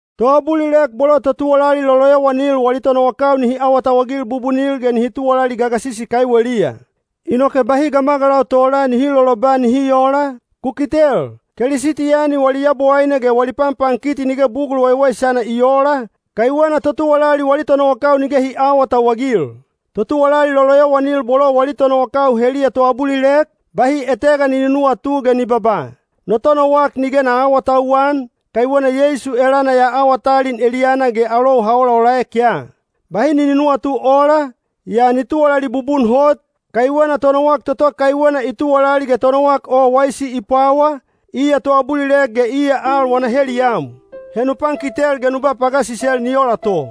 Toabulilek bolo totuwalali loloyowanil wali tonowakau nihi awatauwagil bubunil ge nihi tuwalali gagasisi kaiweliya. Inoke bahi gamagalau tola nihi loloba nihi oola, “Ku kitel, Kelisitiyani wali Yabowaine ge wali panpankiti nige bugul waiwaisana i oola, kaiwena totuwalali wali tonowakau nige hi aawatauwagil.” Totuwalali loloyowanil bolo wali tonowakau heliya toabulilek, bahi etega ni nunuwatu ge ni babaa, “No tonowak nige na aawatauwan, kaiwena Yeisu elana ya awa talin eliyana ge alou ha olaolaek ya.” Bahi ni nunuwatu ola, yaa ni tuwalali bubun hot, kaiwena tonowak toto kaiwena i tuwalali ge tonowak waisi i pwawa, iya toabulilek ge iya al wana heliyam. He nu pankitel ge nu ba pagasisel ni ola to.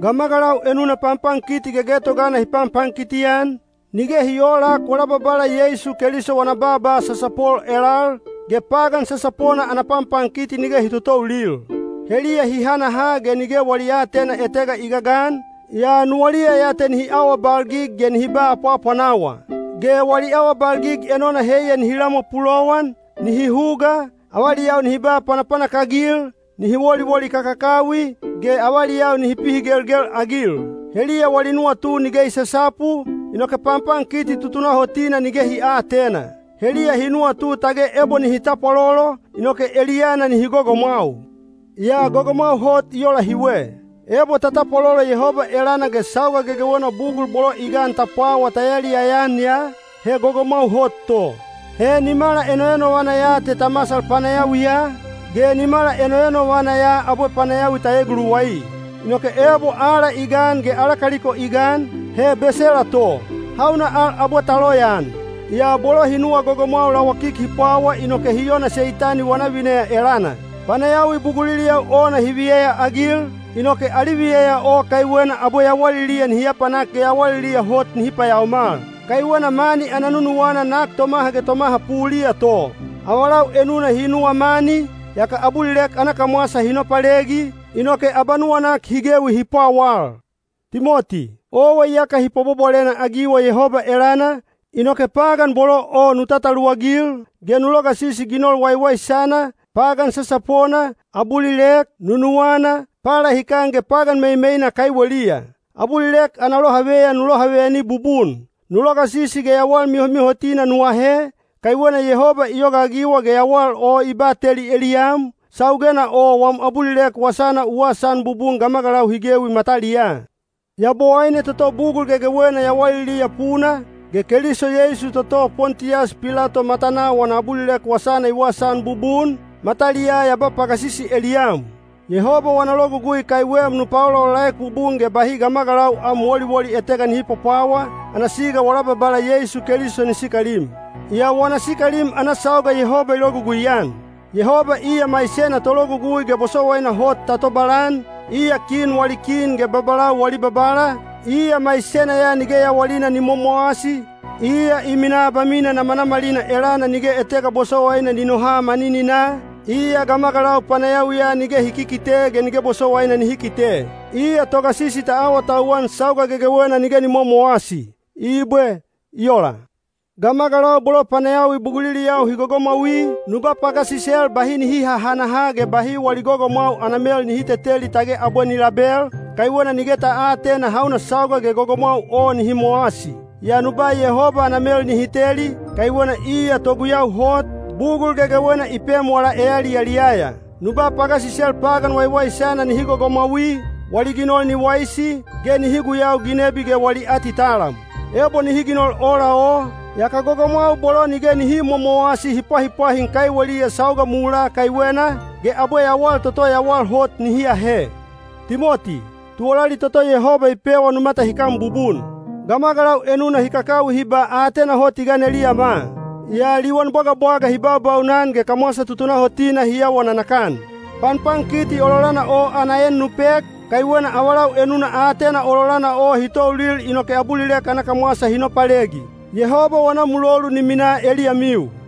Gamagalau enuna panpankiti gegetogana hi panpankiti-an, nige hi oolak wala Babala Yeisu Keliso wana baaba sasapol elal, ge pagan sasapona ana panpankiti nige hi totoulil. Heliya hi hanaha ge nige wali aatena etega i gagan, yaa nuwaliya ya te nihi awabalgig ge nihi ba apwaapwanawa. Ge wali awabalgig enona heiya nihi lamwa pulowan, nihi huga, avaliyau nihi ba panapanak-agil, nihi woliwoli kakakawi, ge avaliyau nihi pihigelgel-agil. Heliya wali nuwatu nige i sasapu, inoke panpankiti tutunahotina nige hi aatena. Heliya hi nuwatu tage ebo nihi tapwalolo, inoke eliyana nihi gogomwau. Yaa gogomwau hot i ola hiwe. Ebo ta tapwalolo Yehoba elana ge sauga gegewena bugul bolo i gan ta pwawa ta yaliyaya-an ya, he gogomwau hot to. He nimala enoenovana ya te ta masal panayawiya, ge nimala enoenovana ya abwe panayawi ta eguluwai. Inoke ebo aala i gan ge ala kaliko i gan, he besela to. Hauna al abwe ta loyaan? Yaa bolo hi nuwa gogomwau lawakik hi pwawa inoke hi ona Seitani wana vineya elana. Panayawi buguliliyau ona hi viyeyaagil, inoke ali viyeya o kaiwena abwe yawaliliya nihi apanak ge yawaliliya hot nihi payaomal. Kaiwena mani ana nunuwana nak tomaha ge tomaha puliya to. Avalau enuna hi nuwa mani, yaka abulilek ana kamwasa hi nopalegi, inoke abanuwanak hi gewi hi pwawal. Timoti, owa iyaka hi pwabwabwalena-agiwa Yehoba elana, inoke pagan bolo o nu tataluwagil, ge nu logasisi ginol waiwaisana, pagan sasapona, abulilek, nunuwana, palahikan ge pagan meimeina kaiweliya. Abulilek ana lohaveyan nu lohaveyani bubun. Nu logasisi ge yawal mihomihotina nu ahe, kaiwena Yehoba i yogaagiwa ge yawal o i bateli eliyam, saugena o wam abulilek wasana u wasaan bubun gamagalau hi gewi mataliyaa. Yabowaine toto bugul gegewena yawaliliya puna, ge Keliso Yeisu toto Pontiyas Pilato matanaa wana abulilek wasana i wasaan bubun, mataliyaa ya ba pagasisi eliyam: Yehoba wana logugui kaiwem nu paolaolaek bubun ge bahi gamagalau am woliwoli etega nihi pwapwawa, ana siga wala Babala Yeisu Keliso ni sikalim. Yaa wana sikalim ana sauga Yehoba i logugui-an. Yehoba iya maisena Tologugui ge bosowaina hot ta tobalan, iya kin wali Kin ge babalau wali Babala, iya maisena ya nige yawalina ni momowasi, iya i minaa abamina namanamalina elana nige etega bosowaina ni noha manininaa, iya gamagalau panayawiya nige hi kikite ge nige bosowaina nihi kite. Iya Togasisi ta awatauwan sauga gegewena nige ni momowasi. Ibwe. I ola. Gamagalau bolo panayawi buguliliyau hi gogomwaui, nu ba pagasisel bahi nihi hahanaha ge bahi wali gogomwau ana mel nihi teteli tage abwe ni label, kaiwena nige ta aatena hauna sauga ge gogomwau o nihi mowasi. Yaa nu ba Yehoba ana mel nihi teli, kaiwena iya toguyau hot, bugul gegewena i pem wala eyaliyaliyaya. Nu ba pagasisel pagan waiwaisana nihi gogomwaui, wali ginol ni waisi, ge nihi guyau ginebi ge wali atitalam. Ebo nihi ginol ola o, yaka gogomwau bolo nige nihi momowasi hi pwahipwahin kaiweliya sauga mulaa kaiwena, ge abwe yawal toto yawal hot nihi ahe. Timoti, tuwalali toto Yehoba i pewa nu matahikan bubun. Gamagalau enuna hi kakawi hi ba “Aatena hot i gan eliyama,” yaa liwan bwagabwaga hi baubaunan ge kamwasa tutunahotina hi awa nanakan. Panpankiti ololana o ana en nu pek, kaiwena avalau enuna aatena ololana o hi toulil inoke abulilek ana kamwasa hi nopalegi. Yehoba wana mulolu ni minaa eliyamiu.